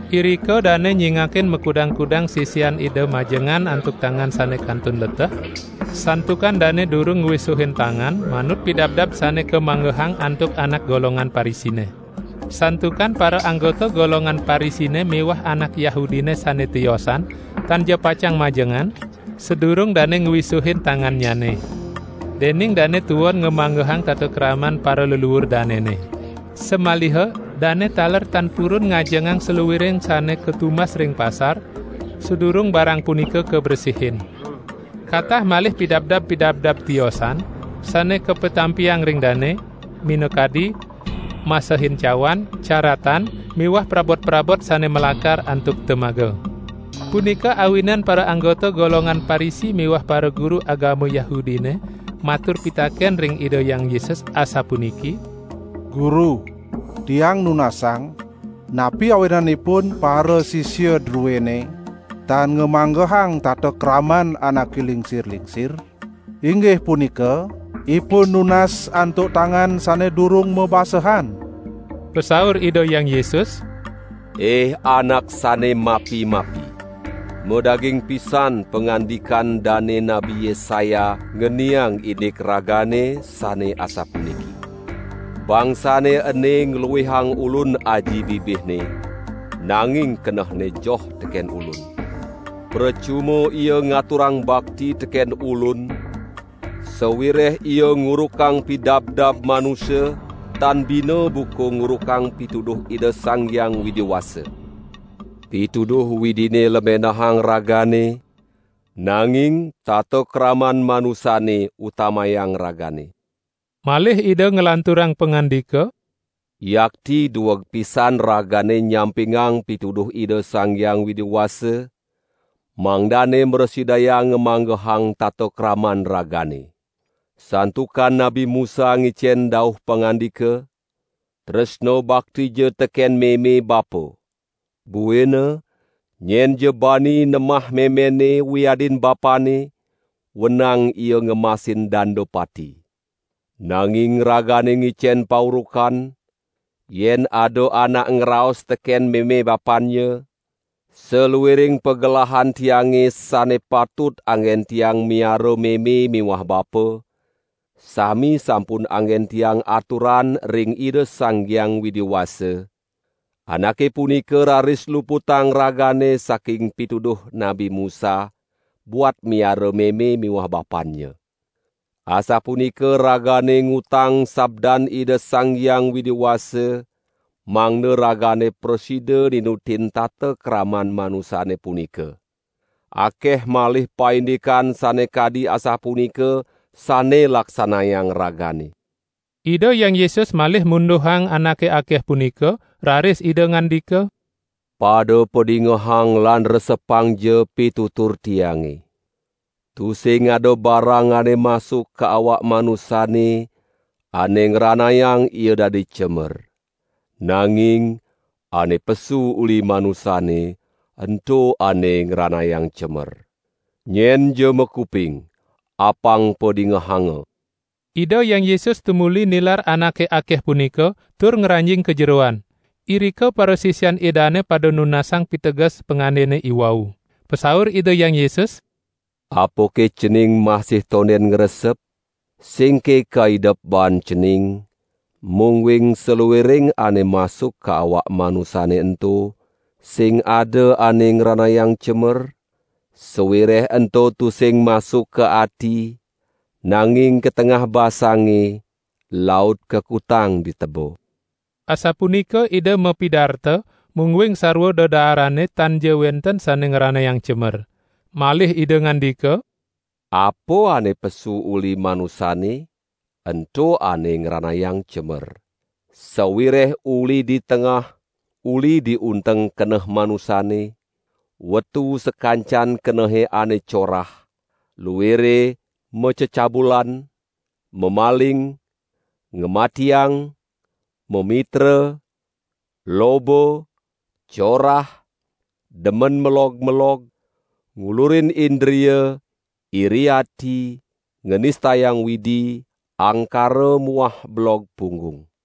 Irika dane nyingakin makudang-kudang sisian Ida majengan antuk tangan sane kantun leteh, santukan dane durung ngwisuhin tangan manut pidabdab sane kamanggehang antuk anak golongan Parisine. Santukan paraanggota golongan Parisine miwah anak Yahudine sane tiosan tanja pacang majengan sadurung dane ngwisuhin tangannyane. Dening dane tuon ngamanggehang tata kraman paraleluur danene. Samaliha dane taler tan purun ngajengang saluiring sane katumbas ring pasar, sadurung barang punika kabresihin. Katah malih pidabdab-pidabdab tiosan sane kapatampiang ring dane, minakadi: masehin cawan, caratan miwah prabot-prabot sane malakar antuk temaga. Punika awinan paraanggota golongan Parisi miwah paraguru agama Yahudine matur pitaken ring Ida Hyang Yesus, asapuniki: "Guru, tiang nunasang, napi awinanipun parasisia druene tan ngamanggehang tata kraman anake lingsir-lingsir, inggih punika ipun nunas antuk tangan sane durung mabasehan?" Pasaur Ida Hyang Yesus: "Ih anak sane mapi-mapi. Madaging pisan pangandikan dane Nabi Yesaya ngeniang indik ragane, sane asapuniki: Bangsane ene ngluihang Ulun aji bibihne, nanging kenehne joh teken Ulun. Precuma ia ngaturang bakti teken Ulun, sawireh ia ngurukang pidabdab manusa tan bina buka ngurukang pituduh Ida Sang Hyang Widi Wasa!' Pituduh Widine lemenahang ragane, nanging tata kraman manusane utamayang ragane." Malih Ida nglanturang pangandika: "Yakti dueg pisan ragane nyampingang pituduh Ida Sang Hyang Widi Wasa, mangdane mrasidayang ngamanggehang tata kraman ragane. Santukan Nabi Musa ngicen dauh pangandika: 'Tresna baktija teken meme bapa!' Buina: 'Nyenja bani nemah memenne wiadin bapanne, wenang ia ngemasin danda pati.' Nanging ragane ngicen paurukan: Yen ada anak ngraos teken meme bapannya: 'Saluiring pagelahan tiange sane patut anggen tiang miara meme miwah bapa, sami sampun anggen tiang aturan ring Ida Sang Hyang Widi Wasa,' anake punika raris luputang ragane saking pituduh Nabi Musa buat miara meme miwah bapannya. Asapunika ragane ngutang sabdan Ida Sang Hyang Widi Wasa, mangda ragane prasida ninutin tata kraman manusane punika. Akeh malih paindikan sane kadi asapunika sane laksanayang ragane." Ida Hyang Yesus malih munduhang anake akeh punika, raris Ida ngandika: "Pada padingehang lan resepangja pitutur Tiange! Tusing ada barang ane masuk ka awak manusane, ane ngranayang ia dadi cemer. Nanging ane pesu uli manusane, ento ane ngranayang cemer. [ Nyenja makuping, apang padingehanga!]" Ida Hyang Yesus tumuli nilar anake akeh punika, tur ngranjing ka jeroan. Irika parasisian Idane pada nunasang piteges pangandene iwau. Pasaur Ida Hyang Yesus: "Apake cening masih tonden ngresep? Singke kaidep baan cening, mungguing saluiring ane masuk ka awak manusane ento sing ada ane ngranayang cemer? Sawireh ento tusing masuk ka ati, nanging ka tengah basange, laut kakutang di teba." (Asapunika Ida mapidarta mungguing sarwa dedaarane tanja wenten sane ngranayang cemer.) Malih Ida ngandika: "Apa ane pesu uli manusane, ento ane ngranayang cemer. Sawireh uli di tengah, uli di unteng keneh manusane, wetu sakancan kenehe ane corah, luire macecabulan, mamaling, ngamatiang, mamitra, loba, corah, demen melog-melog, ngulurin indria, iri ati, nganistayang Widi, angkara muah belog punggung.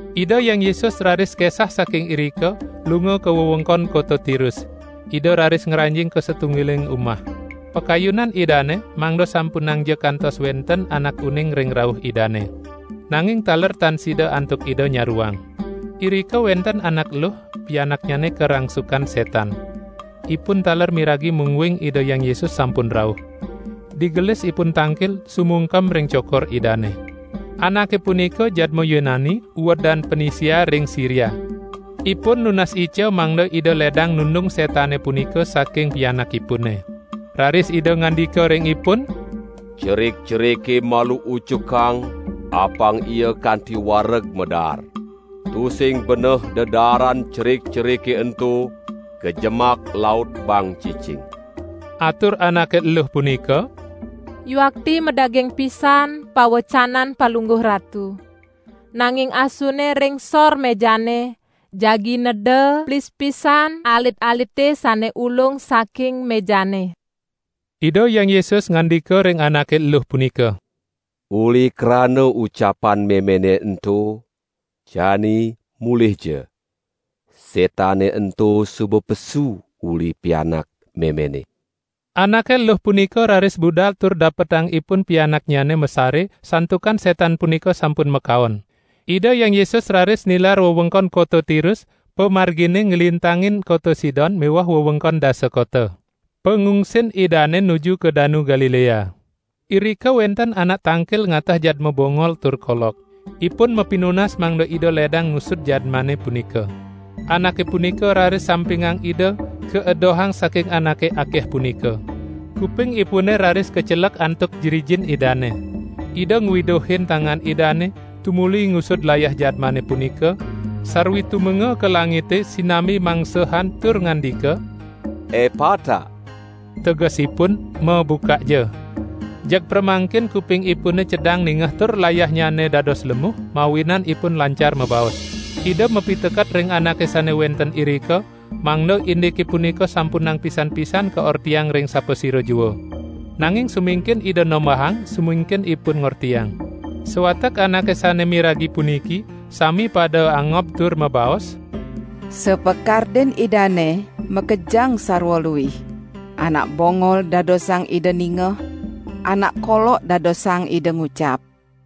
Ida Hyang Yesus raris kesah saking irika, lunga ka wewengkon kota Tirus. Ida raris ngranjing ka satunggiling umah. Pakayunan Idane mangda sampunangja kantos wenten anak uning ring rauh Idane. Nanging taler tan sida antuk Ida nyaruang. Irika wenten anak eluh, pianaknyane karangsukan setan. Ipun taler miragi mungguing Ida Hyang Yesus sampun rauh. Digelis ipun tangkil, sumungkem ring cokor Idane. Anake punika jadma Yunani uedan Penisia ring Siria. Ipun nunas ica mangda Ida ledang nundung setane punika saking pianakipune. Raris Ida ngandika ring ipun: "Cerik-cerike malu ucukang apang ia kanti wareg madaar. Tusing beneh dedaaran cerik-cerike ento kajemak laut baang cicing." Atur anake eluh punika: "Yuakti madaging pisan pawecanan Palungguh Ratu. Nanging asune ring sor mejane, jagi neda plispisan alit-alite sane ulung saking mejane." Ida Hyang Yesus ngandika ring anake eluh punika: "Uli krana ucapan memene ento, jani mulihja. Setane ento suba pesu uli pianak memene." Anake eluh punika raris budal tur dapetang ipun pianaknyane masare, santukan setan punika sampun makaon. Ida Hyang Yesus raris nilar wewengkon kota Tirus, pamargine nglintangin kota Sidon miwah wewengkon Dasa Kota. Pangungsin Idane nuju ka Danu Galilea. Irika wenten anak tangkil ngateh jadma bongol tur kolok. Ipun mapinunas mangda Ida ledang ngusud jadmane punika. Anake punika raris sampingang Ida kaedohang saking anake akeh punika. Kupingipune raris kacelek antuk jrijin Idane. Ida ngwiduhin tangan Idane tumuli ngusud layah jadmane punika, sarwi tumenga ka langite sinambi mangsehan tur ngandika: "Epata!" tegesipun: "Mabukakja!" Jeg pramangkin kupingipune cedang ningeh tur layahnyane dados lemuh, mawinan ipun lancar mabaos. Ida mapiteket ring anake sane wenten irika, mangda indike punika sampunang pisan-pisan kaortiang ring sapasira jua. Nanging sumingkin Ida nombahang, sumingkin ipun ngortiang. Sawatek anake sane miragi puniki sami pada angob tur mabaos: "Sapakardin Idane makejang sarwa luih. Anak bongol dadosang Ida ningeh, anak kolok dadosang Ida ngucap."